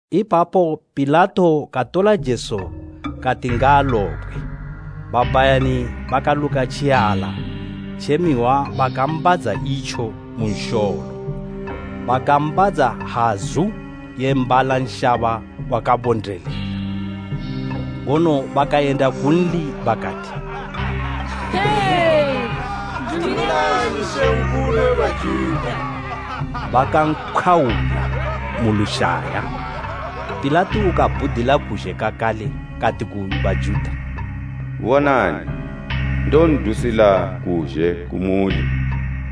Ipapo Pilato katola Jesu kati ngaalobgwe. Babhayani bakaluka tjiala tje mihwa bakaambadza itjo mu nsholo, bakaambadza hazu ye mbala nshaba wakabondelela; ngono bakayenda kunli bakati, “Dumilani, Mambo we Bajuta,” bakampkhwaula mu lushaya. Pilato kabhudila kuzhe kakale kati ku Bajuta, “Bonani, ndon'dusila kuzhe kumuli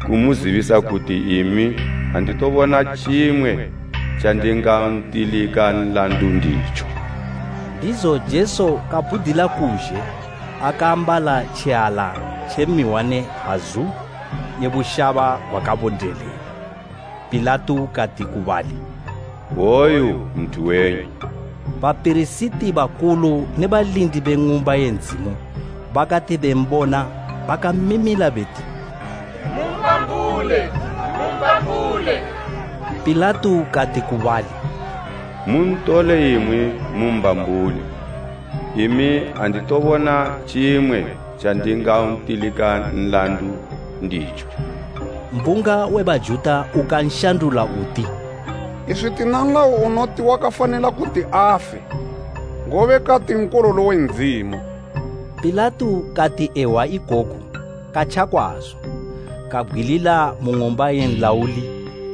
kumuzibisa kuti imi anditobona tjimwe tjandingantilika nlandu nditjo.” Ndizo Jesu kabhudila kuzhe, akaambala tjiala tje mihwa ne hazu ye bushaba gwakabondelela. Pilato kati ku bali, “Woyu nthu wenyu!” Bapirisiti bakulu ne balindi be Ng'umba ye Ndzimu bakati bembona, bakamimila beti, “Mumbambule! Mumbambule!” Pilato kati ku bali, “Muntole imwi mumbambule. Imi anditobona tjimwe tjandingantilika nlandu nditjo.” Mbunga we Bajuta ukanshandula uti, “Iswi tina nlayo unoti wakafanila kuti afe, ngobe kati Nkololo we Ndzimu.” Pilato kati ehwa ikoku katja kwazo, kabgwilila mu ng'umba ye nlauli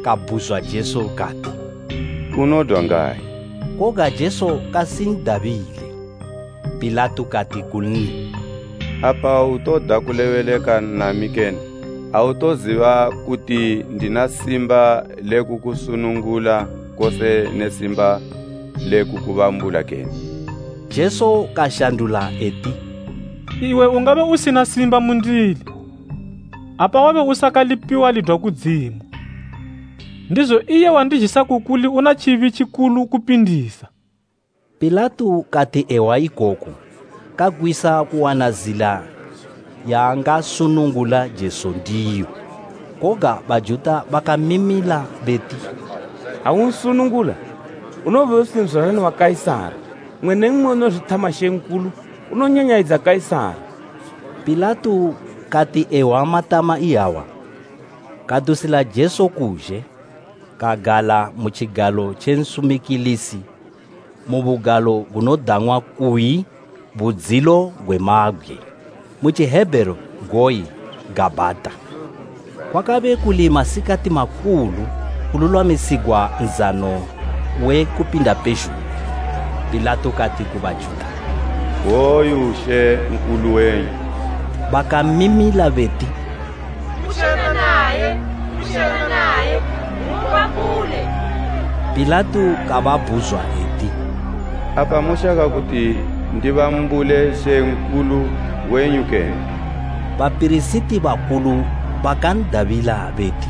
kabhuzwa Jesu kati, “Unodwa ngayi?” Koga Jesu kasindabile. Pilato kati kunli, “Apa autoda kulebeleka nami kene? Autoziba kuti ndina simba le kukusunugula kose ne simba le kukubambula kene?” Jesu kashandula eti, “Iwe ungabe usina simba mundili, apa wabe usakalipiwa lidwa kudzimu. Ndizo iye wandizhisa ku kuli una tjibi tjikulu kupindisa.” Pilato kati ehwa ikoku, kagwisa kuwana zila yaangasunungula Jesu ndiyo. Koga Bajuta bakamimila beti “Ha unsungunula, unowobe usi nzwalani wa Kaisara! Mmwe ne mmwe unozwithama mambo, unonyanyayidza Kaisara!” Pilato kati ehwa matama iyawa, kadusila Jesu kuzhe, kagala mu tjigalo tje nsumikilisi mu bugalo gunodang'wa kuyi, “Budzilo gwe Mabgwe.” Mu Tjihebheru goyi “Gabhata.” Kwakabe kuli masikati makulu kululwamisigwa Nzano we Kupinda pezhugwi. Pilato kati ku Bajuta, “Woyu Mambo wenyu!” Bakamimila beti, “Kutjena naye, kutjena naye mumbambule!” Pilato kababhuzwa eti, “Apa moshaka kuti ndibambule mambo wenyu kene?” Bapirisiti bakulu bakan'dabila beti,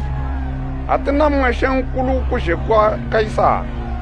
“Atina mmwe mambo kuzhe kwa Kaisara!”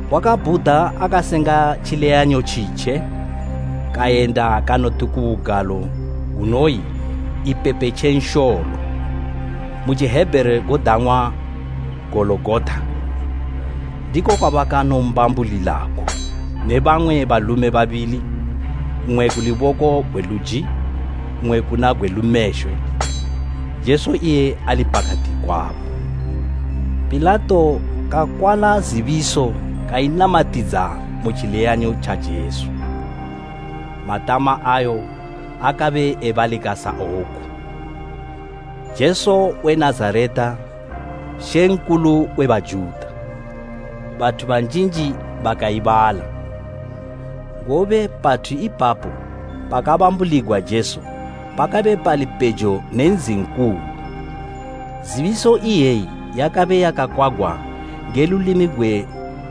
Wakabhuda akasenga tjileyanyo tjitje, kayenda kanoti ku bugalo gunoyi “Ipepe tje Nsholo.” Mu Tjihebheru godang'wa “Gologota.” Ndiko kwabakanombambulilako ne bamwe balume babili, mmwe ku luboko gwe luji, mmwe kuna gwe lumeshwe, Jesu iye ali pakati kwabo. Pilato kakwala zibiso kainamatidza mu tjileyanyo tja Jesu. Matama ayo akabe ebalika sa woku, “JESU WE NAZARETA, MAMBO WE BAJUTA.” Bathu banjinji bakaibala, ngobe pathu ipapo pakabambuligwa Jesu pakabe pali pejo ne nzi nkulu. Zibiso iyeyi yakabe yakakwagwa nge lulimi gwe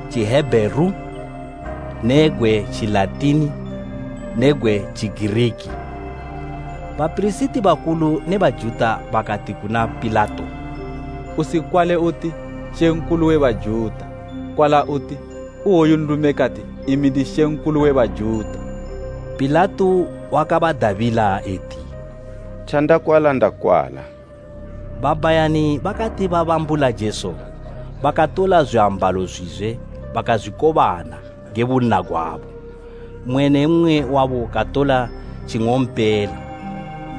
Tjihebheru ne gwe Tjilatini ne gwe Tjigiriki. Bapirisiti bakulu ne Bajuta bakati kuna Pilato, “Usikwale uti ‘MAMBO WE BAJUTA’ kwala uti, ‘Iwoyu nlume kati, imi ndi mambo we Bajuta.’” Pilato wakabadabila eti, “Tjandakwala ndakwala.” Babhayani bakati babambula Jesu, bakatola zwiambalo zwizwe bakazwikobana nge bunna gwabo, mmwe ne mmwe wabo katola tjing'ompela.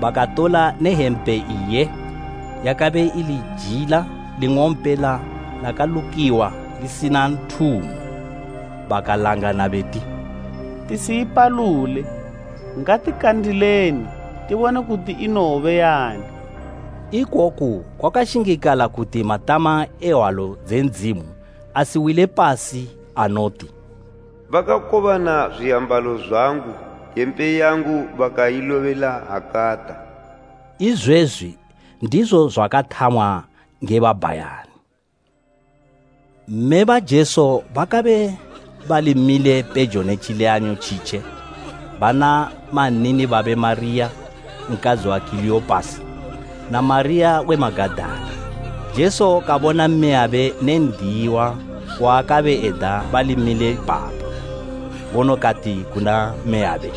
Bakatola ne hempe iye, yakabe ili jila ling'ompela lakalukiwa lisina nthumo. Bakalangana beti, “Tisiipalule, ngatikandileni tibone kuti inowobe ya ani.” Ikoku kwakashingikala kuti matama e Hwalo dze Ndzimu asiwile pasi anoti, “Bakakobana zwiambalo zwangu hempe yangu bakailobela hakata.” Izwezwi ndizo zwakathamwa nge babhayani. Mme ba Jesu bakabe bali mile pejo ne tjileyanyo tjitje bana mannini babe Mariya, nkadzi wa Kileopasi, na Mariya we Magadala. Jesu kabona mmeyabe ne n'diyiwa waakabe eda bali mile ipapo, ngono kati kuna mmeyabe,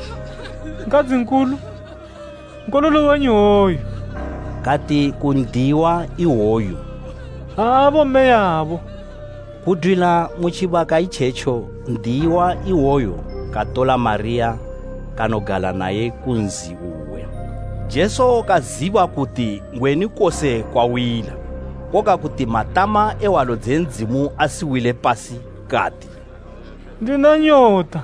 “Nkadzi nkulu, nkololo wenyu hwoyo.” Kati ku n'diyiwa iwoyu, “Abo mmeyabo.” Kudwila mu tjibaka itjetjo n'diyiwa iwoyo katola Mariya kanogala naye ku nzi uwe. Jesu kaziba kuti ngwenu kose kwawila, koga kuti matama e Hwalo dze Ndzimu asiwile pasi kati, “Ndina nyota.”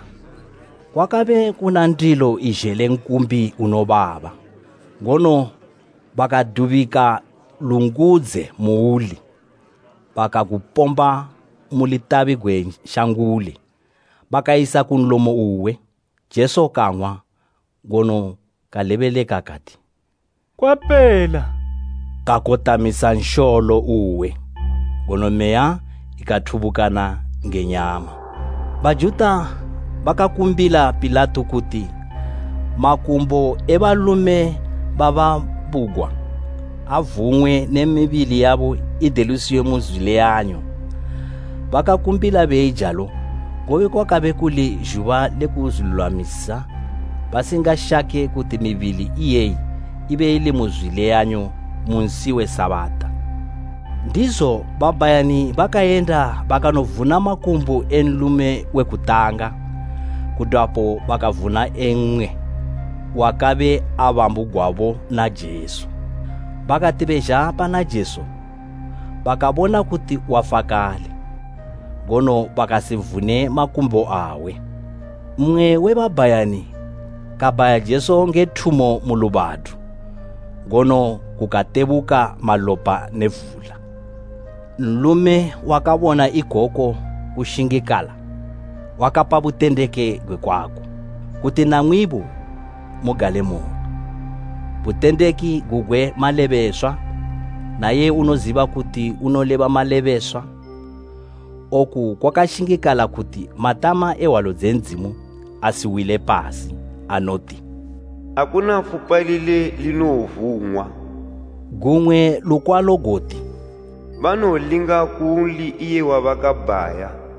Kwakabe kuna ndilo izhele nkumbi unobaba, ngono bakadubika lungudze muuli, bakagupomba mu lushanga gwe nti unoyi hosapu, bakayisa ku nlomo uwe. Jesu kang'wa ngono kalebeleka kati, “Kwapela!” Kakotamisa nsholo uwe ngono meya ikathubukana nge nyama. Bajuta bakakumbila Pilato kuti makumbo e balume babambugwa avung'we ne mibili yabo idelusiwe mu zwileyanyo. Bakakumbila beijalo, ngobe kwakabe kuli zhuba le kuzwilulwamisa, basingashake kuti mibili iyeyi ibe ili mu zwileyanyo mu nsi we Sabata. Ndizo babhayani bakayenda bakanovuna makumbo e nlume we kutanga kudwapo bakavuna e mmwe wakabe abambugwabo na Jesu. Bakati bezha pana Jesu, bakabona kuti wafa kale, ngono bakasivune makumbo awe. Mmwe we babhayani, kabhaya Jesu nge thumo mu lubadu, ngono kukatebuka malopa ne vula. Nlume wakabona ikoku kushingikala wakapa butendeki nge kwako, kuti namwibo mugalemoyo. Butendeki gugwe malebeswa, na iye unoziba kuti unoleba malebeswa. Oku kwakashingikala kuti matama e Hwalo dze Ndzimu asiwile pasi, anoti, “Akuna fupa lile linowovung'wa.” Gumwe lukwalo goti, “Banowolinga kunli iye wabakabhaya.”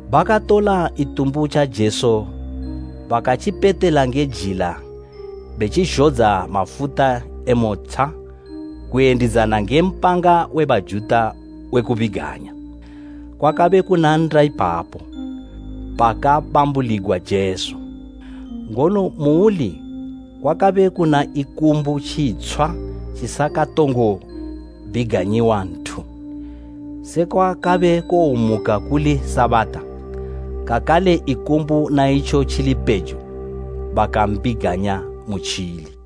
Bakatola itumbu tja Jesu bakatjipetela nge jila betjizhodza mafuta e motsha kuyendidzana nge mpanga we Bajuta we kubiganya. Kwakabe kuna nnda ipapo pakabambuligwa Jesu, ngono muuli kwakabe kuna ikumbu tjitshwa tjisakatongo biganyiwa nthu. Sekwa kabe kuwomuka kuli Sabata, kakale ikumbu na itjo tjili pejo, bakambiganya mutjili.